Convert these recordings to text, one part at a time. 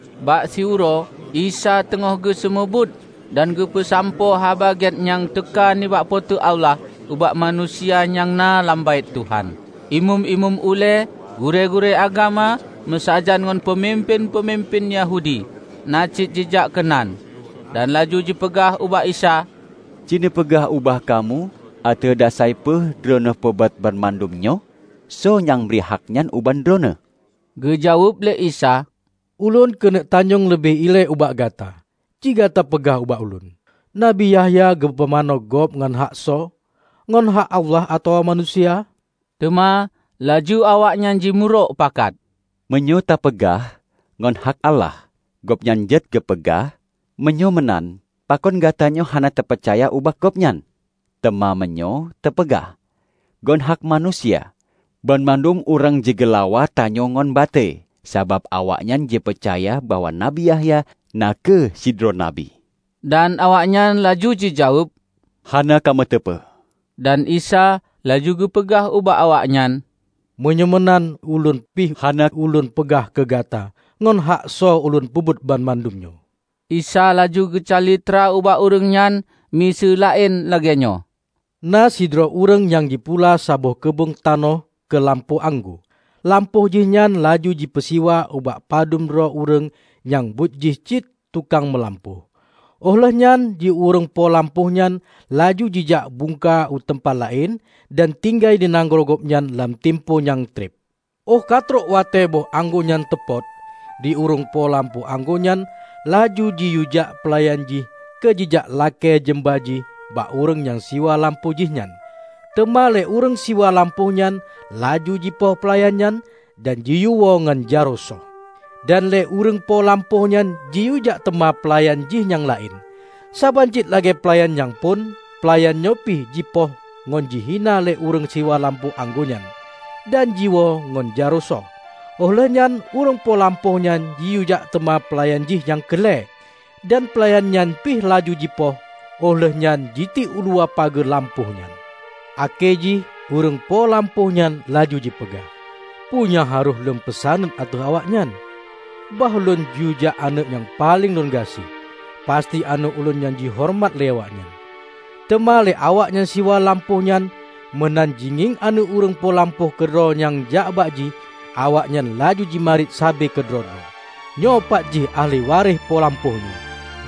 Bak siuroe, Isa teungoh geuseumeubeuet dan geupeusampoe Haba Gét nyang teuka nibak Po teu Allah ubak manusia nyang na lam Baét Tuhan. Imeum-imeum ulée, gurée-gurée agama, meusajan ngon peumimpén-peumimpén Yahudi na cit jijak keunan dan laju jipeugah ubak Isa, "Ci neupeugah ubak kamoe ateueh dasai peue Droeneueh peubuet banmandum nyoe? Soe nyang bri haknyan ubak Droeneueh?" Geujaweueb lé Isa, "Ulôn keuneuk tanyong leubeh ilée ubak gata. Ci gata peugah ubak Ulôn, Nabi Yahya geupumanö gob ngon hak soe? Ngon hak Allah atawa manusia?" Teuma laju awaknyan jimeurok pakat, "Meunyoe tapeugah, 'Ngon hak Allah,' gobnyan jeuet geupeugah, 'Meunyoe meunan, pakon gatanyoe hana tapeucaya ubak gobnyan?' Teuma meunyoe tapeugah 'ngon hak manusia,' banmandum ureuëng jigeulawa tanyoe ngon batée, sabab awaknyan jipeucaya bahwa Nabi Yahya na kheueh sidroe Nabi." Dan awaknyan laju jijaweueb, "Hana kamoe teupeue." Dan Isa laju geupeugah ubak awaknyan, "Meunyoe meunan Ulôn pih hana Ulôn peugah keu gata ngon hak soe Ulôn peubuet banmandum nyoe." Isa laju geucalitra ubak ureuëng nyan, miseue laén lagéenyoe, "Na sidroe ureuëng nyang jipula saboh keubeueng tanoh keu lampôh anggô. Lampôh jih nyan laju jipeusiwa bak padub droe ureuëng nyang buet jih cit tukang meulampôh, óh lheueh nyan di ureuëng po lampôh nyan laju jijak bungka u teumpat laén dan tinggai di nanggroe gobnyan lam timpo nyang treb. Óh katrok watée boh anggô nyan teupot, di ureuëng po lampôh anggô nyan laju jiyuejak peulayan jih keu jijak lakée jeumba jih bak ureuëng nyang siwa lampôh jih nyan. Teuma lé ureuëng siwa lampôh nyan laju jipoh peulayan nyan dan jiyuewoe ngon jaroe soh. Dan lé ureuëng po lampôh nyan jiyuejak teuma peulayan jih nyang laén, saban cit lagée peulayan nyang phon peulayan nyoe pih jipoh ngon jihina lé ureuëng siwa lampôh anggô nyan, dan jiwoe ngon jaroe soh. Óh lheueh nyan ureuëng po lampôh nyan jiyuejak teuma peulayan jih nyang keu lhée. Dan peulayan nyan pih laju jipoh óh lheueh nyan jitiek uluwa pageue lampôh nyan. Akhé jih ureuëng po lampôh nyan laju jipeugah, 'Peu nyang harôh lôn peusaneut ateueh awaknyan? Bah lôn yuejak aneuëk nyang paleng lôn gaséh. Pasti aneuëk ulôn nyan jihoreumat lé awaknyan!' Teuma lé awak nyang siwa lampôh nyan meunan jingieng aneuëk ureuëng po lampôh keudroe nyang jak bak jih, awaknyan laju jimarit sabe keudroe-droe, 'Nyoepat jih ahli waréh po lampôh nyoe.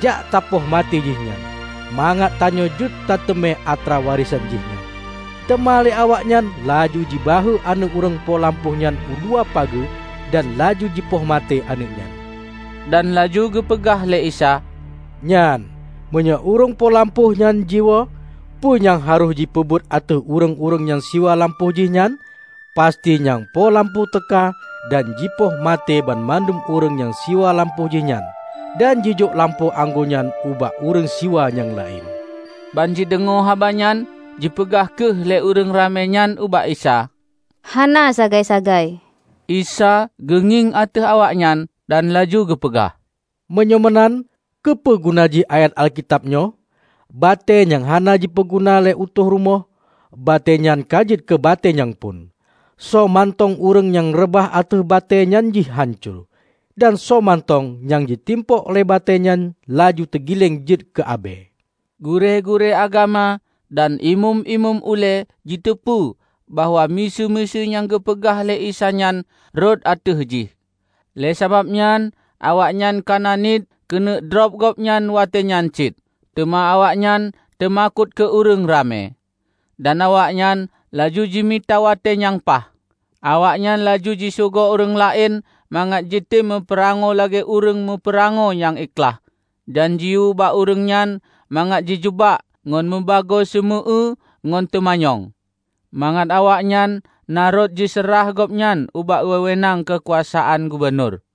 Jak tapoh maté jihnyan, mangat tanyoe jeuet tateumé atra warésan jihnyan.' Teuma lé awaknyan laju jibahue aneuëk ureuëng po lampôh nyan uluwa pageue dan laju jipoh maté aneuëk nyan." Dan laju geupeugah lé Isa, "Nyan, meunyoe ureuëng po lampôh nyan jiwoe, peue nyang harôh jipeubuet ateueh ureuëng-ureuëng nyang siwa lampôh jihnyan? Pasti nyang po lampôh teuka dan jipoh maté banmandum ureuëng nyang siwa lampôh jih nyan, dan jijok lampôh anggô nyan ubak ureuëng siwa nyang laén." Banjideungoe haba nyan, jipeugah kheueh lé ureuëng ramé nyan ubak Isa, "Hana sagai-sagai!" Isa geungieng ateueh awaknyan dan laju geupeugah, "Meunyoe meunan, keupeuguna jih ayat Alkitab nyoe? 'Batée nyang hana jipeuguna lé utôh rumoh, batée nyan ka jeuet keu batée nyang phon.' Soe mantong ureuëng nyang reubah ateueh batée nyan jihnyan hanco; dan soemantong nyang jitimpok lé batée nyan laju teugileng jeuet keu abée." Gurée-gurée agama dan Imeum-imeum ulée jiteupeue bahwa miseue-miseue nyang geupeugah lé Isa nyan rhot ateueh jih. Lé sabab nyan awaknyan kana niet keuneuk drob gobnyan watée nyan cit, teuma awaknyan teumakot keu ureuëng ramé. Dan awaknyan laju jimita watée nyang paih. Awaknyan laju jisugok ureuëng laén mangat jitem meupeurangoe lagée ureuëng meupeurangoe nyang ikhlaih, dan jiyue bak ureuëng nyan mangat jijeubak ngon mubagoe seumeu-eue ngon teumanyong, mangat awaknyan na rot jiseurah gobnyan ubak wewenang keukuasaan gubunur.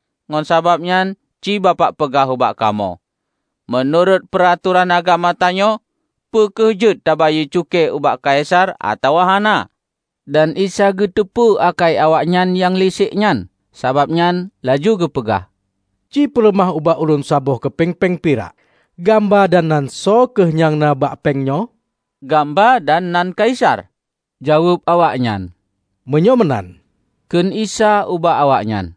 Ngon sabab nyan ci Bapak peugah ubak kamoe, meunurot peuratoran agama tanyoe, peu kheueh jeuet tabayeue cukée ubak Kaisar atawa hana?" Dan Isa geuteupeue akai awaknyan nyang lisék nyan. Sabab nyan laju geupeugah, "Cipeuleumah ubak ulôn saboh keupeng péng pirak. Gamba dan nan soe kheueh nyang na bak péng nyoe?" "Gamba dan nan Kaisar!" jaweueb awaknyan. "Meunyoe meunan," kheun Isa ubak awaknyan,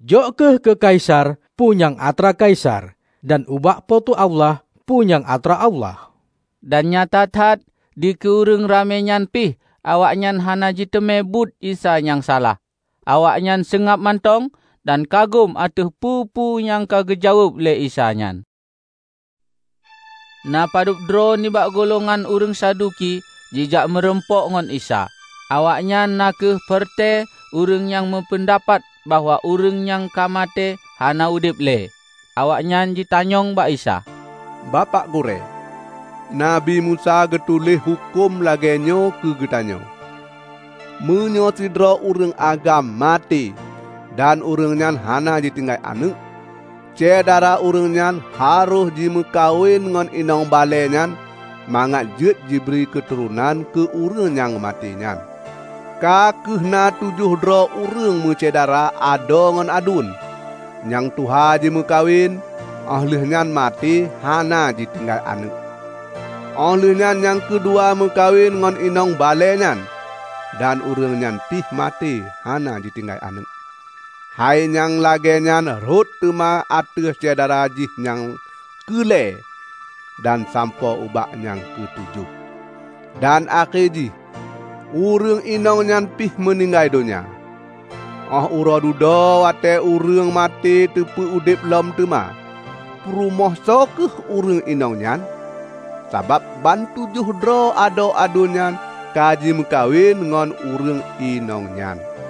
"Jok kheueh keu Kaisar, peue nyang atra Kaisar dan ubak Po teu Allah, peu nyang atra Allah." Dan nyata that dikeue ureuëng ramé nyan pih awaknyan hana jiteumé buet Isa nyang salah. Awaknyan seungab mantong dan kagum ateueh peue-peue nyang ka geujaweueb lé Isa nyan. Na padubdroe nibak gulongan ureuëng Saduki jijak meurumpok ngon Isa. (Awaknyan na kheueh peureute ureuëng nyang meupeundapat bahwa ureuëng nyang ka maté hana udeb le.) Awaknyan jitanyong bak Isa, "Bapak Gurée, Nabi Musa geutuléh huköm lagée nyoe keu geutanyoe: Meunyoe sidroe ureuëng agam maté dan ureuëng nyan hana jitinggai aneuëk, syedara ureuëng nyan harôh jimeukawen ngon inong balée nyan mangat jeuet jibri keuturonan keu ureuëng nyang ka maté nyan. Ka kheueh na tujoh droe ureuëng meusyedara adoe ngon aduen. Nyang tuha jimeukawen, óh lheueh nyan maté hana jitinggai aneuëk. Óh lheueh nyan nyang keudua meukawen ngon inong balée nyan, dan ureuëng nyan pih maté hana jitinggai aneuëk. Hai nyang lagée nyan rhot teuma ateueh syedara jih nyang keu lhée dan sampoe ubak nyang keutujoh. Dan akhé jih ureuëng inong nyan pih meuninggai donya. Óh uroe dudoe watée ureuëng maté teupeu-udeb lom teuma, peurumoh soe kheueh ureuëng inong nyan? Sabab bantujoh droe adoe aduen nyan ka jimeukawen ngon ureuëng inong nyan."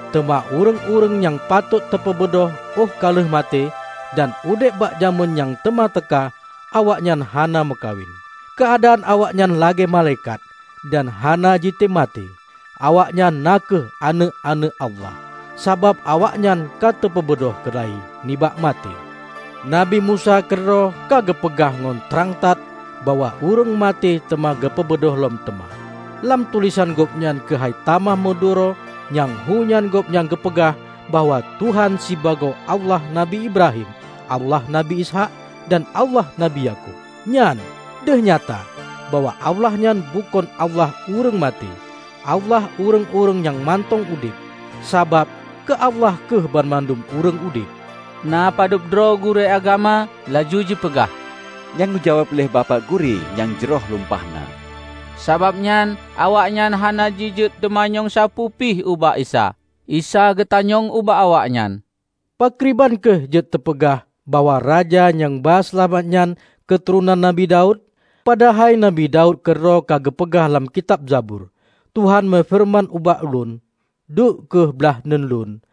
teuma ureuëng-ureuëng nyang patôt teupeubeudôh óh ka lheueh maté, dan udeb bak jamén nyang teuma teuka, awaknyan hana meukawen. Keuadaan awaknyan lagée malaikat, dan hana jitem maté. Awaknyan na kheueh aneuëk-aneuëk Allah, sabab awaknyan ka teupeubeudôh keula-i nibak maté. Nabi Musa keudroe ka geupeugah ngon trang that bahwa ureuëng maté teuma geupeubeudôh lom teuma. Lam tulésan gobnyan keuhai tamah meuduro nyang hu nyan gobnyan geupeugah bahwa Tuhan sibagoe 'Allah Nabi Ibrahim, Allah Nabi Ishaq dan Allah Nabi Yakub'. Nyan, deuh nyata, bahwa Allah nyan bukon Allah ureuëng maté! Allah ureuëng-ureuëng nyang mantong udeb! Sabab, keu Allah kheueh banmandum ureuëng udeb." Na padubdroe gurée agama laju jipeugah, "Nyang geujaweueb lé Bapak Gurée nyan jroh lumpah na." Sabab nyan awaknyan hana jijeuet teumanyong sapeue pih ubak Isa. Isa geutanyong ubak awaknyan, "Pakriban kheueh jeuet teupeugah bahwa Raja nyang ba Seulamat nyan keuturonan Nabi Daud? Padahai Nabi Daud keudroe ka geupeugah lam kitab Zabur, 'Tuhan meufeureuman ubak Tuhan Lôn: Duek kheueh blaih uneuen Lôn,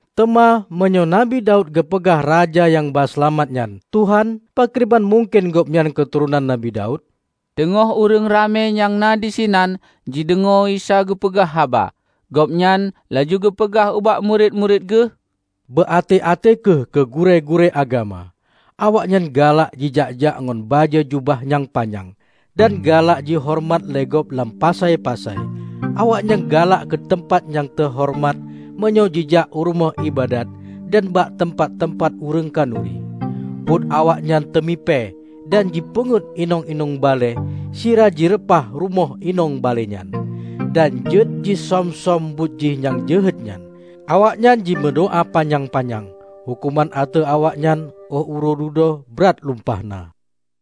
Teuma, meunyoe Nabi Daud geupeugah Raja nyang ba seulamat nyan 'Tuhan', pakriban mungken Gobnyan keuturonan Nabi Daud?" Teungoh ureuëng ramé nyang na disinan jideungoe Isa geupeugah haba, gobnyan laju geupeugah ubak murit-murit Geuh, "Beu até-até kheueh keu gurée-gurée agama. Awaknyan galak jijak-jak ngon bajée jubah nyang panyang, dan galak jihoreumat lé gob lam pasai-pasai. Awaknyan galak keu teumpat nyang teuhoreumat meunyoe jijak u rumoh iébadat dan bak teumpat-teumpat ureuëng khanuri. Buet awaknyan teumipée dan jipeungeuet inong-inong balée sira jireupah rumoh inong balée nyan. Dan jeuet jisöm-söm buet jih nyang jeuhet nyan, awaknyan jimeudoá panyang-panyang! Huköman ateueh awaknyan óh uroe dudoe brat lumpah na!"